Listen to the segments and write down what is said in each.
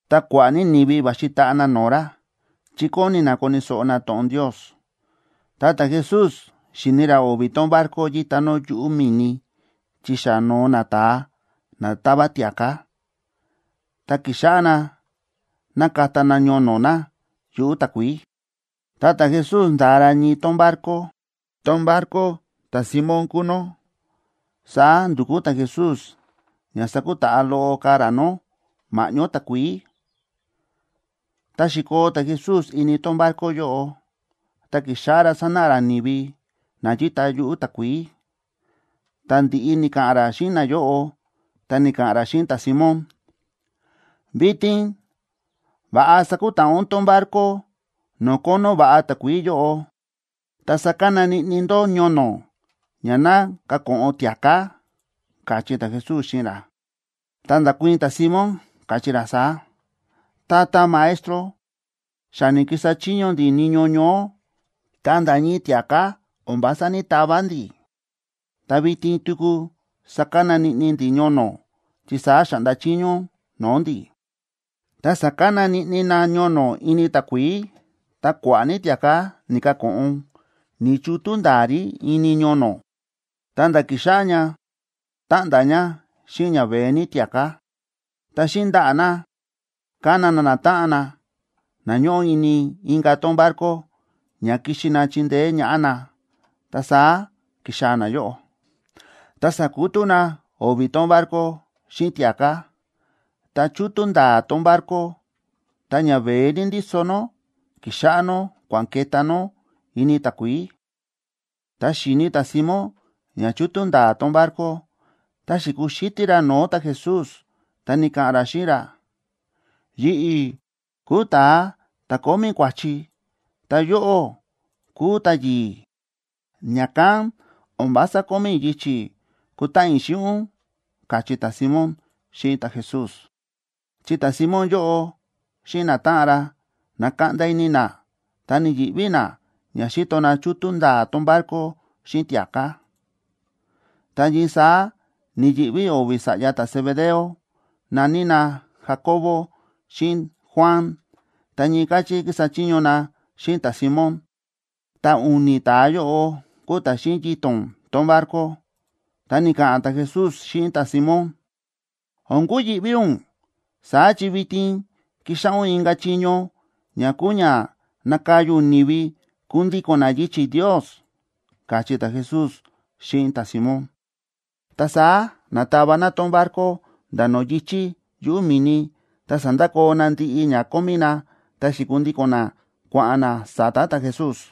Ta kua̱ꞌa̱ ní ni̱vi va̱xi taꞌa na no̱o̱ ra, chi kóni na koni̱ so̱ꞌo na to̱ꞌon Ndios. Ta ta̱Jesús xi̱ni ra o̱vi̱ tón barco yíta nó yuꞌu̱ mi̱ni chi xa no̱o nata̱a na táva tia̱ká, ta ki̱xáꞌá na nákata na ñono̱ na yuꞌu̱ takuií. Ta ta̱Jesús nda̱a ra ñii tón barco, tón barco ta̱Simón kúu nó. Saá ndu̱kú ta̱Jesús ña sakutaꞌa loꞌo ka̱ ra nó ma̱ꞌñó takuií. Ta xi̱koo ta̱Jesús ini tón barco yóꞌo, ta ki̱xáꞌá ra sánáꞌa ra ni̱vi na yíta yuꞌu̱ takuií. Tá ndi̱ꞌi ni̱ka̱ꞌa̱n ra xíꞌin nayóꞌo, ta ni̱ka̱ꞌa̱n ra xíꞌin ta̱Simón: ―Vitin va̱ꞌa sakutaꞌa ún tón barco no̱o̱ kónó va̱ꞌa takuií yóꞌo, ta sakana niꞌni ndó ñono̱ ña ná kako̱ꞌon tia̱ká ―káchí ta̱Jesús xíꞌin ra. Ta nda̱kuii̱n ta̱Simón, káchí ra saá: ―Tata Maestro, xa ni̱kisa chiño ndi̱ niño ñoó, ta nda̱ ñii tia̱ká o̱n vása ní‑tava ndi̱. Ta vitin tuku sakana niꞌni ndi̱ ñono̱, chi saá xa̱ꞌnda chiño ún no̱o̱ ndi̱. Ta sa̱kana niꞌni na ñono̱ ini takuií, ta kua̱ꞌa̱ ní tia̱ká ni̱kako̱ꞌon. Ni̱chútú nda̱a̱ rí ini ñono̱, ta̱nda̱ ki̱xáꞌá ña táꞌnda̱ ña xíꞌin ña veé ní tia̱ká. Ta xíꞌin ndaꞌa̱ na ka̱na na natáꞌan na, na ñóꞌo ini inka̱ tón barco, ña kixi na chindeé ñaꞌá na. Ta saá ki̱xaa̱ nayóꞌo, ta sa̱kutú na o̱vi̱ tón barco xíꞌin tia̱ká. Ta chútú nda̱a̱ tón barco, ta ña veé ní ndíso nó ki̱xáꞌá nó kua̱n ke̱tá nó ini takuií. Tá xi̱ni ta̱Simón ña chútú nda̱a̱ tón barco, ta xi̱kuxítí ra no̱o̱ ta̱Jesús, ta ni̱ka̱ꞌa̱n ra xíꞌin ra: ―Yi̱ꞌi̱ kúu ta̱a ta̱ kómí kua̱chi, ta yóꞌó kúu ta̱yi̱i̱. Ña̱kán o̱n vása kómí i̱ yichi̱ kutáꞌan i̱ xíꞌin ún ―káchí ta̱Simón xíꞌin ta̱Jesús. Chi ta̱Simón yóꞌo xíꞌin natáꞌan ra, na̱kaꞌnda ini na ta ni̱yi̱ꞌví na ña xíto na chútú nda̱a̱ tón barco xíꞌin tia̱ká. Ta ñii saá ni̱yi̱ꞌví o̱vi̱ sa̱ꞌya ta̱Zebedeo, na̱ní na Jacobo xíꞌin Juan, ta ñii káchí kísa chiño na xíꞌin ta̱Simón, ta u̱ni̱ ta̱a yóꞌo kúu ta̱ xíꞌin yito̱n tón barco. Ta ni̱ka̱ꞌa̱n ta̱Jesús xíꞌin ta̱Simón: ―O̱n kuyi̱ꞌví ún. Saá chi vitin kíxáꞌá ún inka̱ chiño, ña kúu ña nakaya ún ni̱vi kundíko̱n na yichi̱ Ndios ―káchí ta̱Jesús xíꞌin ta̱Simón. Ta saá na̱tava na tón barco nda̱ no̱o̱ yi̱chí yuꞌu̱ mi̱ni, ta sa̱ndakoo na ndiꞌi ña kómí na, ta xi̱kundíko̱n na kua̱ꞌa̱n na sa̱ta̱ ta̱Jesús.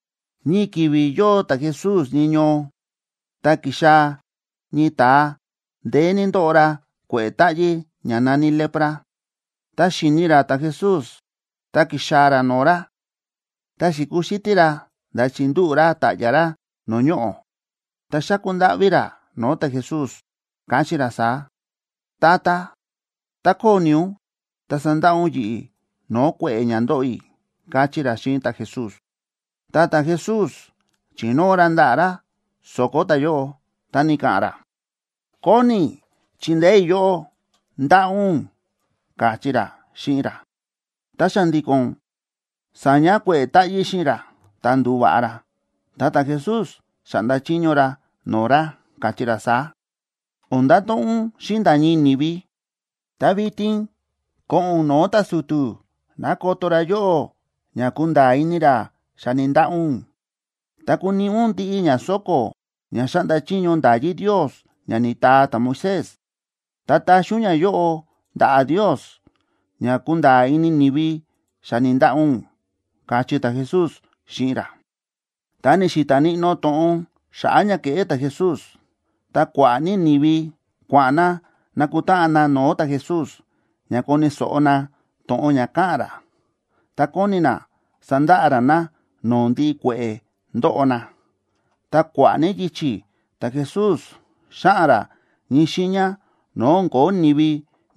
Ñii ki̱vi̱ yóo ta̱Jesús ñii ñoo, ta ki̱xaa̱ ñii ta̱a ndeé ní ndóꞌo ra kue̱ꞌe̱ táꞌyí ña na̱ní lepra. Tá xi̱ni ra ta̱Jesús, ta ki̱xaa̱ ra no̱o̱ ra, ta xi̱kuxítí ra nda̱ chi̱ndúꞌu̱ ra ta̱ꞌya̱ ra no̱o̱ ñoꞌo̱, ta xa̱ku ndáꞌví ra no̱o̱ ta̱Jesús, káchí ra saá: ―Tata, tá kóni ún, ta sandaꞌa ún yi̱ꞌi̱ no̱o̱ kue̱ꞌe̱ ña ndóꞌo i̱ ―káchí ra xíꞌin ta̱Jesús. Ta ta̱Jesús chi̱nóo ra ndaꞌa̱ ra so̱ko̱ ta̱yóꞌo, ta ni̱ka̱ꞌa̱n ra: ―Kóni i̱ chindeé i̱ yóꞌó. ¡Ndaꞌa ún! ―káchí ra xíꞌin ra. Ta xa̱ndi̱ko̱n sa̱ña kue̱ꞌe̱ táꞌyí xíꞌin ra, ta ndu̱va̱ꞌa ra. Ta ta̱Jesús xa̱ꞌnda chiño ra no̱o̱ ra, káchí ra saá: ―O̱n ndato̱ꞌon ún xíꞌin nda̱ ñii ni̱vi. Ta vitin ko̱ꞌo̱n ún no̱o̱ ta̱su̱tu̱ ná koto ra yóꞌó ña kunda̱a̱ ini ra xa ni̱ndaꞌa ún. Ta kuniꞌi ún ndiꞌi ña so̱ko̱ ña xáꞌnda chiño nda̱yí Ndios ña ni̱taa ta̱Moisés, ta taxi ún ñayóꞌo ndaꞌa̱ Ndios ña kunda̱a̱ ini ni̱vi xa ni̱ndaꞌa ún ―káchí ta̱Jesús xíꞌin ra. Ta ni̱xi̱ta̱ níꞌnó to̱ꞌon xa̱ꞌa̱ ña ke̱ꞌé ta̱Jesús, ta kua̱ꞌa̱ ní ni̱vi kua̱ꞌa̱n na nakutáꞌan na no̱o̱ ta̱Jesús ña koni̱ so̱ꞌo na to̱ꞌon ña káꞌa̱n ra, ta kóni na sandaꞌa ra na no̱o̱ ndiꞌi kue̱ꞌe̱ ndóꞌo na. Ta kua̱ꞌa̱ ní yichi̱ ta̱Jesús xáꞌa̱n ra ñii xiiña no̱o̱ o̱n ko̱ó ni̱vi,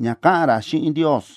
ña ka̱ꞌa̱n ra xíꞌin Ndios.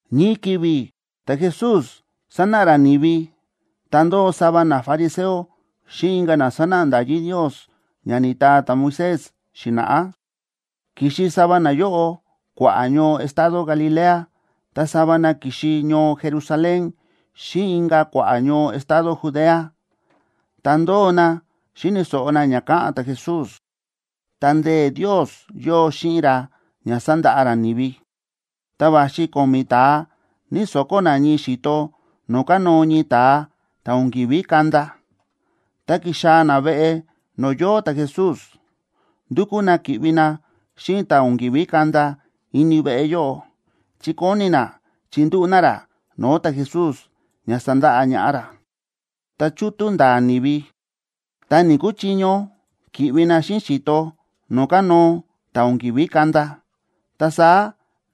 Ñii ki̱vi̱ ta̱Jesús sánáꞌa ra ni̱vi, ta ndóo sava nafariseo xíꞌin inka̱ na sánáꞌa nda̱yí Ndios ña ni̱taa ta̱Moisés xi̱na̱ꞌá. Ki̱xi sava nayóꞌo kua̱ꞌa̱ ñoo estado Galilea, ta sava na ki̱xi ñoo Jerusalén xíꞌin inka̱ kua̱ꞌa̱ ñoo estado Judea. Ta ndóo na xíni̱ so̱ꞌo na ña káꞌa̱n ta̱Jesús, ta ndee̱ Ndios yóo xíꞌin ra ña sandaꞌa ra ni̱vi. Ta va̱xi ko̱mi̱ ta̱a ñíso̱kó na ñii xi̱to no̱o̱ kánóo ñii ta̱a ta̱ o̱n ki̱ví kanda, ta ki̱xaa̱ na veꞌe no̱o̱ yóo ta̱Jesús. Ndúkú na ki̱ꞌvi na xíꞌin ta̱ o̱n ki̱ví kanda ini veꞌe yóꞌo, chi kóni na chindúꞌu̱ na ra no̱o̱ ta̱Jesús ña sandaꞌa ñaꞌá ra. Ta chútú nda̱a̱ ni̱vi, ta ni̱‑kuchiño ki̱ꞌvi na xíꞌin xi̱to no̱o̱ kánóo ta̱ o̱n ki̱ví kanda. Ta saá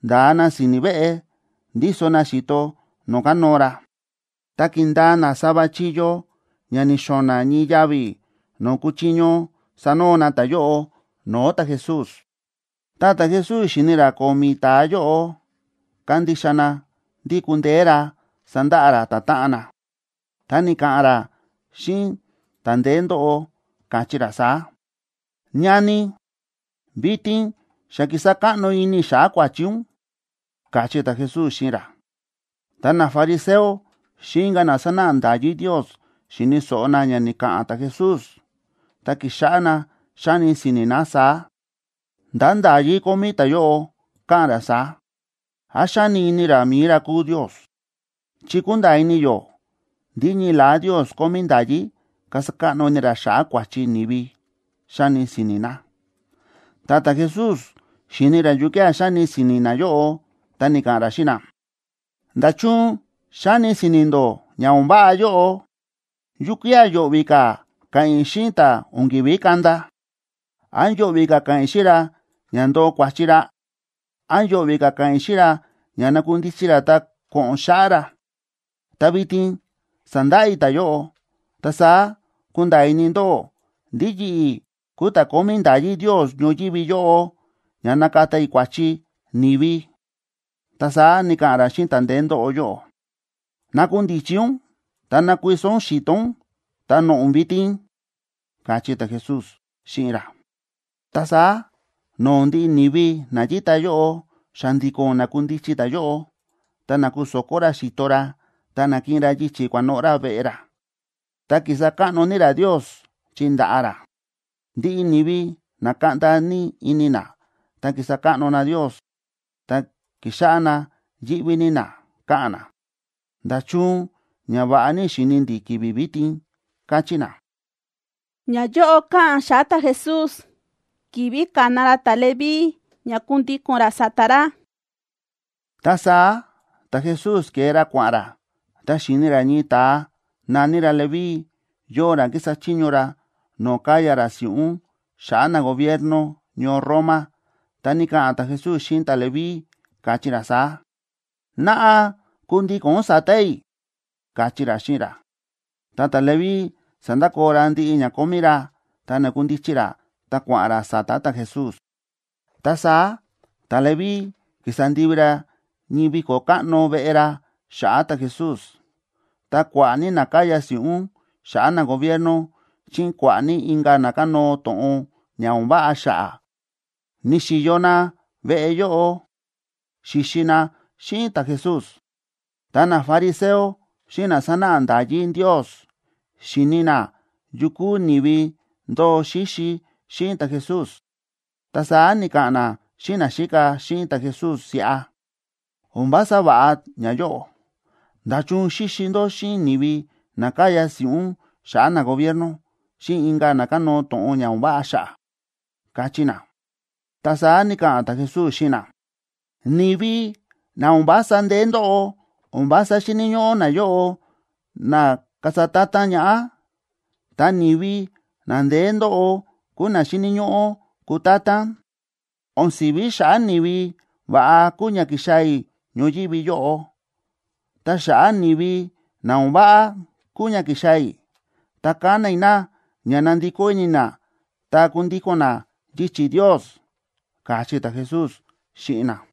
nda̱a na si̱ni̱ veꞌe, ndíso na xi̱to no̱o̱ kánóo ra, ta ki̱ndaa na sava chíyó ña ni̱xo̱na̱ ñii yavi̱ no̱o̱ kuchiño sanoo na ta̱yóꞌo no̱o̱ ta̱Jesús. Tá ta̱Jesús xi̱ni ra ko̱mi̱ ta̱a yóꞌo kándixa na ndí kundeé ra sandaꞌa ra ta̱táꞌan na, ta ni̱ka̱ꞌa̱n ra xíꞌin ta̱ ndeé ndóꞌo, káchí ra saá: ―Ñani, vitin xa ki̱sa káꞌno ini i̱ xa̱ꞌa̱ kua̱chi ún ―káchí ta̱Jesús xíꞌin ra. Ta nafariseo xíꞌin inka̱ na sánáꞌa nda̱yí Ndios xi̱ni̱ so̱ꞌo na ña ni̱ka̱ꞌa̱n ta̱Jesús, ta ki̱xáꞌá na xáni si̱ni̱ na saá: “¿Ndá nda̱yí kómí ta̱yóꞌo káꞌa̱n ra saá? ¿Án xáni ini ra mi̱i ra kúu Ndios? Chi kúnda̱a̱ ini yó ndí ñii la̱á Ndios kómí nda̱yí kasa káꞌno ini ra xa̱ꞌa̱ kua̱chi ni̱vi”, xáni si̱ni̱ na. Ta ta̱Jesús xíni̱ ra yukía̱ xáni si̱ni̱ nayóꞌo, ta ni̱ka̱ꞌa̱n ra xíꞌin na: ―¿Nda̱chun xáni si̱ni̱ ndó ña o̱n váꞌa yóꞌo? ¿Yukía̱ yo̱ꞌvi̱ ka̱ ka̱ꞌa̱n i̱ xíꞌin ta̱ o̱n ki̱ví kanda? ¿Án yo̱ꞌvi̱ ka̱ ka̱ꞌa̱n i̱ xíꞌin ra ña ndoo kua̱chi ra? ¿Án yo̱ꞌvi̱ ka̱ ka̱ꞌa̱n i̱ xíꞌin ra ña nakundichi ra ta ko̱ꞌo̱n xáꞌá ra? Ta vitin sandaꞌa i̱ ta̱yóꞌo, ta saá kunda̱a̱ ini ndóꞌó ndí yi̱ꞌi̱ kúu ta̱ kómí nda̱yí Ndios ñoyívi yóꞌo ña nakata i̱ kua̱chi ni̱vi. Ta saá ni̱ka̱ꞌa̱n ra xíꞌin ta̱ ndeé ndóꞌo yóꞌo: ―Nakundichi ún ta ná kuiso ún xi̱to ún, ta noꞌo̱ ún vitin ―káchí ta̱Jesús xíꞌin ra. Ta saá no̱o̱ ndiꞌi ni̱vi na yíta yóꞌo, xa̱ndi̱ko̱n na̱kundichi ta̱yóꞌo, ta na̱kuso̱kó ra xi̱to ra, ta na̱kiꞌin ra yichi̱ kua̱noꞌo̱ ra veꞌe ra. Ta kísa káꞌno ní ra Ndios chi nda̱ꞌa ra. Ndiꞌi ni̱vi na̱kaꞌnda ní ini na, ta kísa káꞌno na Ndios. Ta ki̱xáꞌá na yíꞌví ní na, káꞌa̱n na: ―¡Nda̱chun ñava̱ꞌa ní xi̱ni ndi̱ ki̱vi̱ vitin! ―káchí na. Ñayóꞌo káꞌa̱n xa̱ꞌa̱ ta̱Jesús ki̱vi̱ ka̱na ra ta̱Leví ña kundíko̱n ra sa̱ta̱ ra (inka̱ ki̱vi̱ na̱ní ta̱Leví kúu Mateo) Ta saá ta̱Jesús ke̱e ra kua̱ꞌa̱n ra, ta xi̱ni ra ñii ta̱a na̱ní ra Leví, yóo ra kísa chiño ra no̱o̱ káya ra si̱ꞌún xa̱ꞌa̱ nagobierno ñoo Roma. Ta ni̱ka̱ꞌa̱n ta̱Jesús xíꞌin ta̱Leví, káchí ra saá: ―Naꞌa kundíko̱n ún sa̱ta̱ i̱ ―káchí ra xíꞌin ra. Ta ta̱Leví sa̱ndakoo ra ndiꞌi ña kómí ra, ta na̱kundichi ra, ta kua̱ꞌa̱n ra sa̱ta̱ ta̱Jesús. Ta saá ta̱Leví ki̱sa ndivi ra ñii viko̱ káꞌno veꞌe ra xa̱ꞌa̱ ta̱Jesús. Ta kua̱ꞌa̱ ní na káya si̱ꞌún xa̱ꞌa̱ nagobierno xíꞌin kua̱ꞌa̱ ní inka̱ na kánóo to̱ꞌon ña o̱n váꞌa xa̱ꞌa̱, ni̱xi̱yo na veꞌe yóꞌo xíxi na xíꞌin ta̱Jesús. Ta nafariseo xíꞌin na sánáꞌa nda̱yí Ndios, xi̱ni na yu kúu ni̱vi ndóo xíxi xíꞌin ta̱Jesús. Ta saá ni̱ka̱ꞌa̱n na xíꞌin naxíka xíꞌin ta̱Jesús siꞌa: ―O̱n vása va̱ꞌa ñayóꞌo. ¿Nda̱chun xíxi ndó xíꞌin ni̱vi na káya si̱ꞌún xa̱ꞌa̱ nagobierno, xíꞌin inka̱ na kánóo to̱ꞌon ña o̱n váꞌa xa̱ꞌa̱? ―káchí na. Ta saá ni̱ka̱ꞌa̱n ta̱Jesús xíꞌin na: ―Ni̱vi na o̱n vása ndeé ndóꞌo, o̱n vása xíni̱ ñóꞌó nayóꞌo na kasa ta̱ta̱n ñaꞌá, ta ni̱vi na ndeé ndóꞌo kúu na xíni̱ ñóꞌó kutátán. O̱n si̱ví xa̱ꞌa̱ ni̱vi va̱ꞌa kúu ña ki̱xaa̱ i̱ ñoyívi yóꞌo. Ta xa̱ꞌa̱ ni̱vi na o̱n váꞌa kúu ña ki̱xaa̱ i̱, ta kana i̱ na ña nandikó ini na ta kundíko̱n na yichi̱ Ndios ―káchí ta̱Jesús xíꞌin na.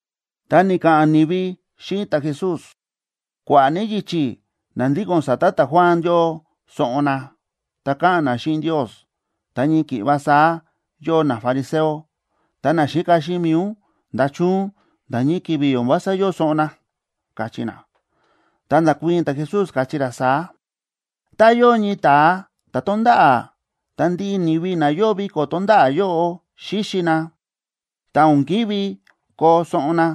Ta ni̱ka̱ꞌa̱n ni̱vi xíꞌin ta̱Jesús: ―Kua̱ꞌa̱ ní yichi̱ na ndíko̱n sa̱ta̱ ta̱Juan yóo soꞌon na, ta káꞌa̱n na xíꞌin Ndios, ta ñii ki̱ꞌva saá yóo nafariseo. Ta naxíka xíꞌin mi̱i ún, ¿nda̱chun nda̱ ñii ki̱vi̱ o̱n vása yóo soꞌon na? ―káchí na. Ta nda̱kuii̱n ta̱Jesús, káchí ra saá: ―Tá yóo ñii ta̱a ta̱ tonda̱ꞌa̱, ta ndiꞌi ni̱vi na yóo viko̱ tonda̱ꞌa̱ yóꞌo xíxi na, ta o̱n ki̱ví koo soꞌon na,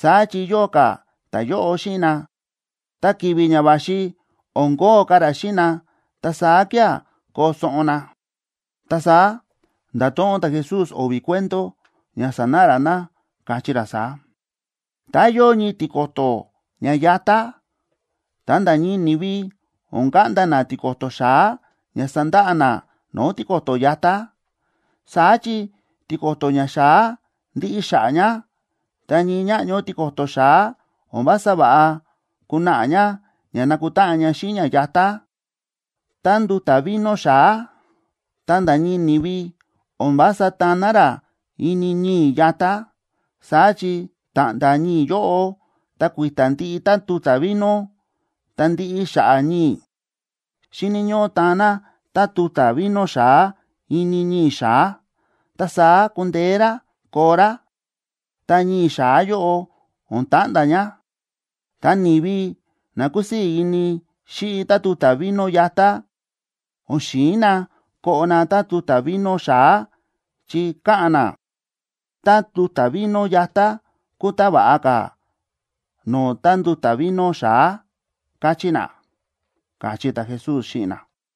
saá chi yóo ka̱ ta̱yóꞌo xíꞌin na. Ta ki̱vi̱ ña va̱xi, o̱n kóo ka̱ ra xíꞌin na. Ta saá kía̱ koo soꞌon na. Ta saá nda̱to̱ꞌon ta̱Jesús o̱vi̱ cuento ña sanáꞌa ra na, káchí ra saá: ―Tá yóo ñii tiko̱to̱ ña yatá, ta nda̱ ñii ni̱vi o̱n kaꞌnda na tiko̱to̱ xa̱á ña sandaꞌa na no̱o̱ tiko̱to̱ yatá. Saá chi tiko̱to̱ ña xa̱á ndiꞌi xa̱ꞌa̱ ña, ta ñii ñáꞌño tiko̱to̱ xa̱á o̱n vása va̱ꞌa kunaꞌa ña ña nakutáꞌan ña xíꞌin ña yatá. Ta nduta̱ vino xa̱á, ta nda̱ ñii ni̱vi o̱n vása taan na rá ini ñii̱ yatá. Saá chi ta̱ꞌnda̱ ñii̱ yóꞌo, ta kui̱ta̱ ndiꞌi tánduta̱ vino, ta ndiꞌi xa̱ꞌa̱ ñii̱. Xíni̱ ñóꞌó taan na tánduta̱ vino xa̱á ini ñii̱ xa̱á, ta saá kundeé rá koo rá, ta ñii̱ xa̱á yóꞌo o̱n ta̱ꞌnda̱ ña. Ta ni̱vi na kúsii̱ ini xíꞌi tánduta̱ vino yatá o̱n xi̱in na koꞌo na tánduta̱ vino xa̱á, chi káꞌa̱n na: “Tánduta̱ vino yatá kúu tá va̱ꞌa ka̱ no̱o̱ tánduta̱ vino xa̱á”, káchí na ―káchí ta̱Jesús xíꞌin na.